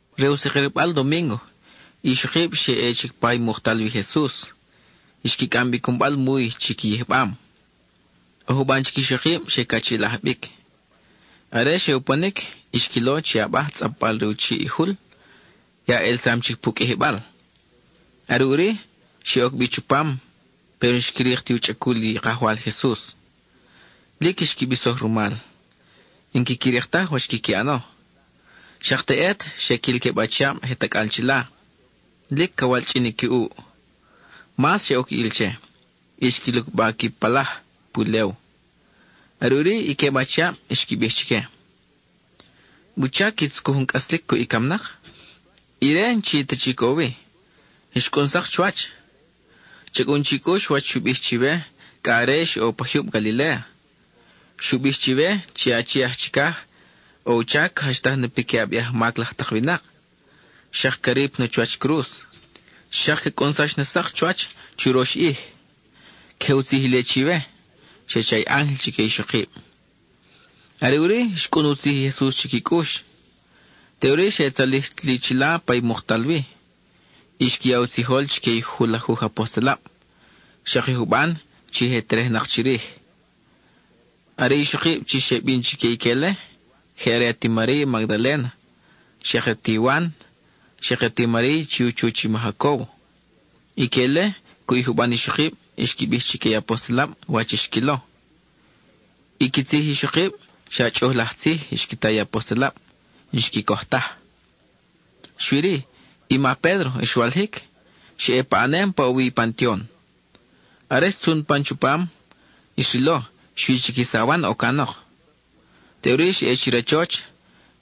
Re u sakirbal domíngo, i ixokib xe ʼe chic pa muktal wi i Jesus; xqui cʼam bi i cunbal muy chi qui yijbam. ʼO juban chic ixokib xe cachiʼilaj bic. Are xe uponic, xquilo chi i abaj tzʼapbal re u chiʼ i jul ya ʼelsam chic pu qʼuijibal. Are ʼuri, xe oc bi chupam, péro n-xqui rik ti u chʼacul i Kajwal Jesus. Lic xqui bisoj rumal, n-quiqui rik taj wach quiqui ʼano. Xak teʼet xe quil queb achiab je tacʼal chila, lic ca walchʼin qui ʼuʼ. Mas xe oc ʼil che, y xqui lucba qui palaj pulew. Are ʼuri i queb achiab xqui bij chique: —¿Wuchac qui tzucuj jun cʼaslic cuʼ i camnak? Ire n-chi ta chic ʼo wi; xcʼun sak chuwach. Cha cʼun chi cʼux wach xu bij chiwe cʼa are ix ʼo pa jyub Galiléa. Xu bij chiwe chi i Achi aj Chicaj ʼo u chac ca jachtaj na piquiʼab i ajmac laj tak winak, xak ca rip na chuwach cruz, xak ca cʼunsax sak chuwach churox ʼij. Queje u tzij ile chiwe —xe cha i ángel chique i ixokib. Are ʼuri xcʼun u tzij i Jesus chi qui cʼux. Teʼuri xe tzalij li chila pa i muktal wi, y xqui ya u tzijol chique i julajuj apostelab, xak i juban chi je terejnak chirij. Are i ixokib chi xe bin chique ique-le, je are ati Mariy Magdaléna, xak ati Wan, xak i ati Mariy chi u chuch i ma Jacóbo. Ique-le cuʼ i juban ixokib xqui bij chique i apostelab wach i xquilo. I qui tzij i ixokib, xa chʼuj laj tzij xqui ta i apostelab; n-xqui coj taj. Xui-ri, i ma Pédro xwalijic, xa ʼe paʼanem pa ʼo wi i pantion. Are xtzun pan chupam, xrilo xui chic i sawan ʼo canok. Teʼuri xa ʼe chi rachoch;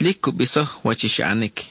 lic cu bisoj wach i xa ʼanic.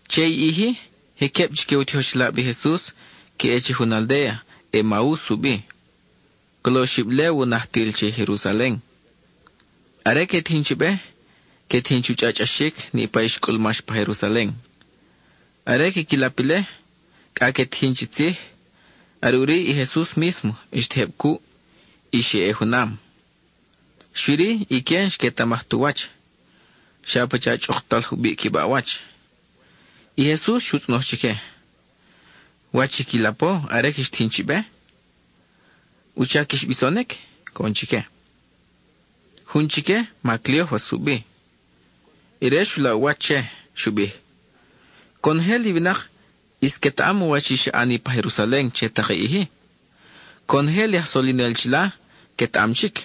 Che i ʼij-i, je queb chique u tijoxelab i Jesus que ʼe che jun aldéa, Emaus u bi; colo oxib légua u najtil che i Jerusalen. Are que tijin chi be, que tijin chu chʼachʼaxic niʼpa i xcʼulmax pa Jerusalen. Are quiqui lap ile, cʼa que tijin chi tzij, are ʼuri i Jesus mísmo xtejeb cuʼ, y xe ʼe junam. Xui-ri ique n-xquetamaj tu wach; xa pacha chʼuktal jubiʼ qui baʼwach. I Jesus xu tzʼonoj chique: —¿Wach i qui lapo are quix tijin chi be? ¿Wuchac quix bisonic? —coʼon chique. Jun chique, ma Cleófas u bi; ire xu laʼ u wach che y xu bij: —Conojel i winak ʼis quetaʼam wach i xa ʼani pa Jerusalen che tak i ʼij-i. Conojel i aj solinel chila quetaʼam chic,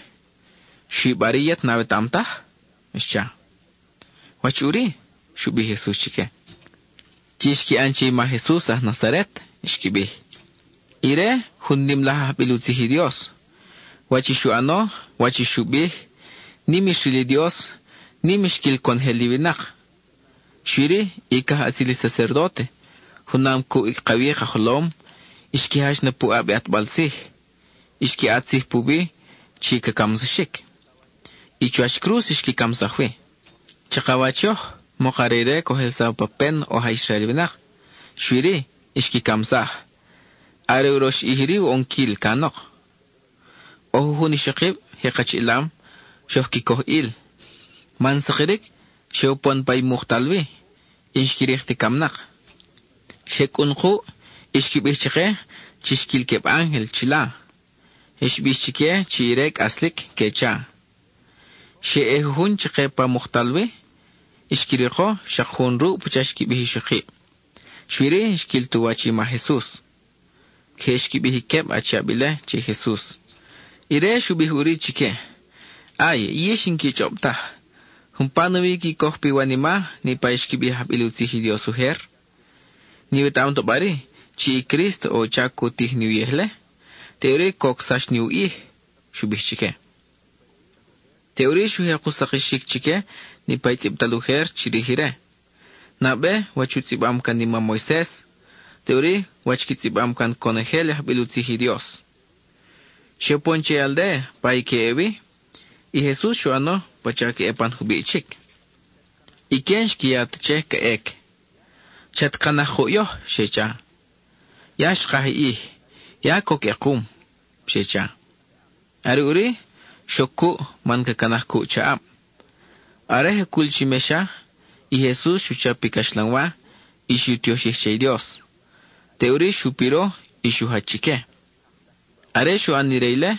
¿xui bari yet n-awetaʼam taj? —xcha. —¿Wach ʼuri? —xu bij i Jesus chique. —Chi xqui ʼan che i ma Jesus aj Nazaret —xqui bij—. Ire jun nim laj ajbil u tzij i Dios. Wach i xu ʼano, wach i xu bij, nim xril i Dios, nim xquil conojel i winak. Xui-ri, i cajʼatzil i sacerdóte junam cuʼ i ka wi ka jolom, xqui jach na puʼab i ʼatbal tzij. Xqui ʼat tzij puwi chi ca camsaxic; y chuwach cruz xqui camsaj wi. Chakawach yoj, mok are ire coj ʼelsaw pa pen oj aj Israel winak, xui-ri, xqui camsaj; are urox ʼij iri u ʼonquil canok. ʼO jujun ixokib je kachiʼilam, xoj qui coj ʼil, man sakiric xe upon pa i muktal wi, y n-xqui rik ti camnak. Xe cʼun kuʼ y xqui bij chake chi xquil queb ángel chila; xbix chique chi ire cʼaslic, que cha. Xe ʼe jujun chake pa i muktal wi; xqui riko xak jun ruʼ pacha xqui bij ixokib, xui-ri, n-xquil tu wach i ma Jesus. (Queje xqui bij i queb achiab ile che i Jesus.) Ire xu bij ʼuri chique: —¡Ay, yix n-qui chʼob taj! ¿Umpa nawi qui coj piwanima niʼpa i xqui bij i ajbil u tzij i Dios ujer? ¿N-iwetaʼam ta bari, chi i Crísto ʼo u chac cu tij ni uyej-le, teʼuri cocsax ni u ʼij? —xu bij chique. Teʼuri xu jek u sakixic chique niʼpa i tzʼibtal ujer chirij ire; nabe, wach u tzʼibam can i mam Moises, teʼuri, wach qui tzʼibam can conojel i ajbil u tzij i Dios. Xe upon che i aldéa pa i que ʼe wi. I Jesus xu ʼano pacha ca ʼe pan jubiʼ chic. Ique n-xqui ya ta che ca ʼec. —Chat canaj kuʼ yoj —xe cha—; ya xkaj i ʼij, ya coc ʼekum —xe cha. Are ʼuri, xoc cuʼ man ca canaj cuʼ chaʼab. Are je cul chi mexa, i Jesus xu chap i caxlanwa, y xu tioxij che i Dios. Teʼuri xu piro y xu jach chique. Are xu ʼan ire ile,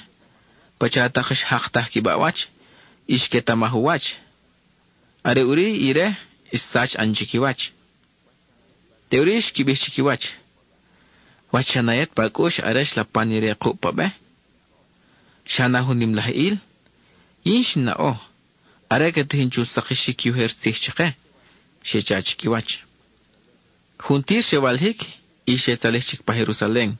pacha tak xjaktaj qui baʼwach y xquetamaj u wach; are ʼuri ire xsach ʼan chiquiwach. Teʼuri xqui bij chiquiwach: —¿Wach xa na yet pa cʼux are xlapan ire kuʼ pa be? ¿Xa na jun nim laj ʼil? ¡Yin xin naʼo! are ca tijin chu sakixic i ujer tzij chake —xe cha chiquiwach. Juntir xe walijic y xe tzalij chic pa Jerusalen.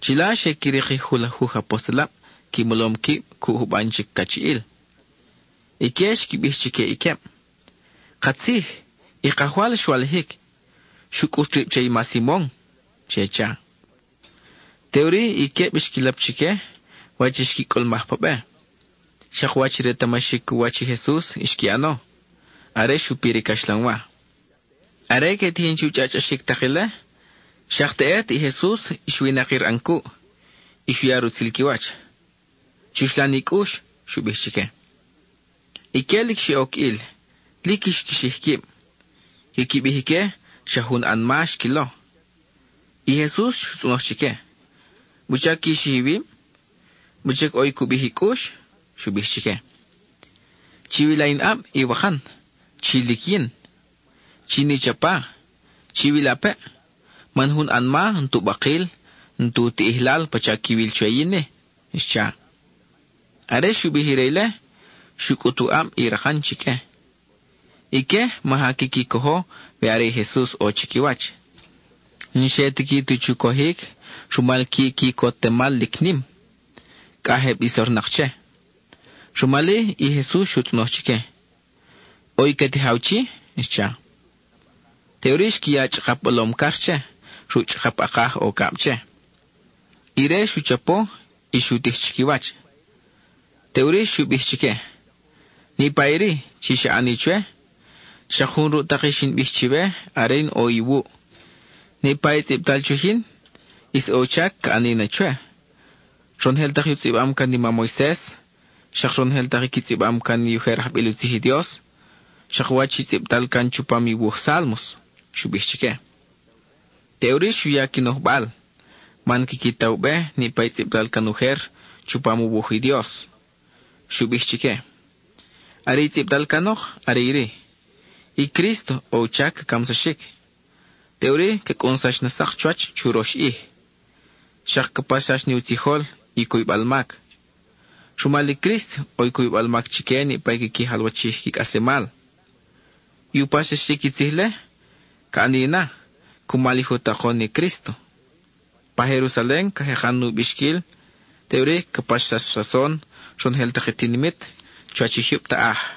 Chila xe qui rik i julajuj apostelab qui molom quib cuʼ juban chic cachiʼil. Ique xqui bij chique i queb: —¡Katzij, i Kajwal xwalijic; xu cʼut rib che i ma Simon! —xe cha. Teʼuri i queb xqui lap chique wach xqui cʼulmaj pa be, xak wach i retamaxic u wach i Jesus xqui ʼano, are xu pir i caxlanwa. Are que tijin chu chʼachʼaxic tak ile, xak teʼet i Jesus xwinakir ʼan cuʼ, y xu ya rutzil qui wach: —¡Chuxlan i cʼux! —xu bij chique. Ique lic xe oc ʼil; lic xqui xij quib. Quiqui bij ique xa jun anma xquilo. I Jesus xu tzʼonoj chique: —¿Wuchac qui xij iwib? ¿Wuchac ʼo i cu bij i cʼux? —xu bij chique. —Chiwila in ʼab, i wakan, ¡chi lic yin! Chin i chapa, chiwilapeʼ, man jun anma n-tu bakil, n-tu tiʼijlal pacha quiwil chwe yin-i —xcha. Are xu bij ire ile, xu cʼut u ʼab i rakan chique. Ique maja quiqui cojo we are i Jesus ʼo chiquiwach. N-xe tiqui ta chu cojic rumal qui quicotemal lic nim; cʼa je bisor-nak che. Rumal-i, i Jesus xu tzʼonoj chique: —¿ʼO i ca tijaw chi? —xcha. Teʼuri xqui ya chʼakap bolom car che, ruʼ chʼakap ʼakaj ʼo cab che. Ire xu chapo y xu tij chiquiwach. Teʼuri xu bij chique: —Niʼpa iri chi xa ʼani chwe, xak jun ruʼ tak i xin bij chiwe are in ʼo iwuʼ. Niʼpa i tzʼibtal chwij yin, ʼis ʼo u chac ca ʼani na chwe; ronojel tak i u tzʼibam can i mam Moises, xak ronojel tak i qui tzʼibam can i ujer ajbil u tzij i Dios, xak wach i tzʼibtal can chupam i wuj Sálmos —xu bij chique. Teʼuri xu ya qui nojbal, man quiqui ta u be niʼpa i tzʼibtal can ujer chupam u wuj i Dios. Xu bij chique: —Are i tzʼibtal canok are iri: “I Crísto ʼo u chac ca camsaxic, teʼuri ca cʼunsax na sak chuwach churox ʼij.” Xak ca paxsax ni u tzijol i cuybal mac; rumal i Crísto ʼo i cuybal mac chique niʼpa quiqui jalwachij qui cʼaslemal. I u paxsaxic i tzij-le, ca ʼani na cumal i je u takon i Crísto. Pa Jerusalen, ca jekan nu bixquil, teʼuri ca paxsax rason ronojel tak i tinimit chuwach i jyub taʼaj.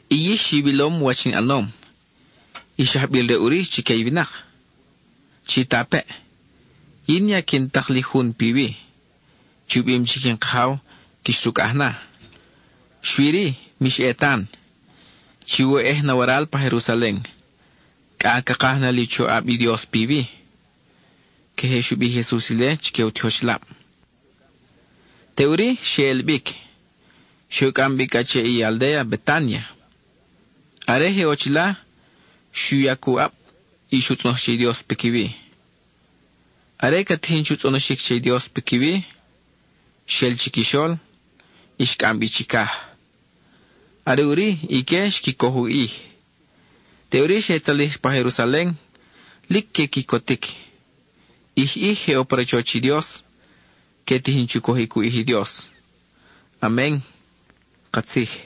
Yix iwilom wach in ʼanom, ix ajbil-re ʼuri chique i winak. Chitapeʼ, yin ya quin tak li Jun piwi chi u bim chic in Kajaw quix rucʼaj na. Xui-ri, mix ʼe tan, chiwoyʼej na waral pa Jerusalen cʼa ca kaj na li u choʼab i Dios piwi. (Queje xu bij i Jesus ile chique i u tijoxelab.) Teʼuri xe ʼel bic, xe u cʼam bi cʼa che i aldéa Betánia; are je ʼo chila xu yac u ʼab y xu tzʼonoj che i Dios piquiwi. Are ca tijin chu tzʼonoxic che i Dios piquiwi, xel chiquixol, y xcʼam bi chicaj. Are ʼuri ique xqui coj u ʼij, teʼuri xe tzalij pa Jerusalen, lic que quicotic. ʼIj ʼij je ʼo pa rachoch i Dios, que tijin chu cojic u ʼij i Dios. Amen (katzij).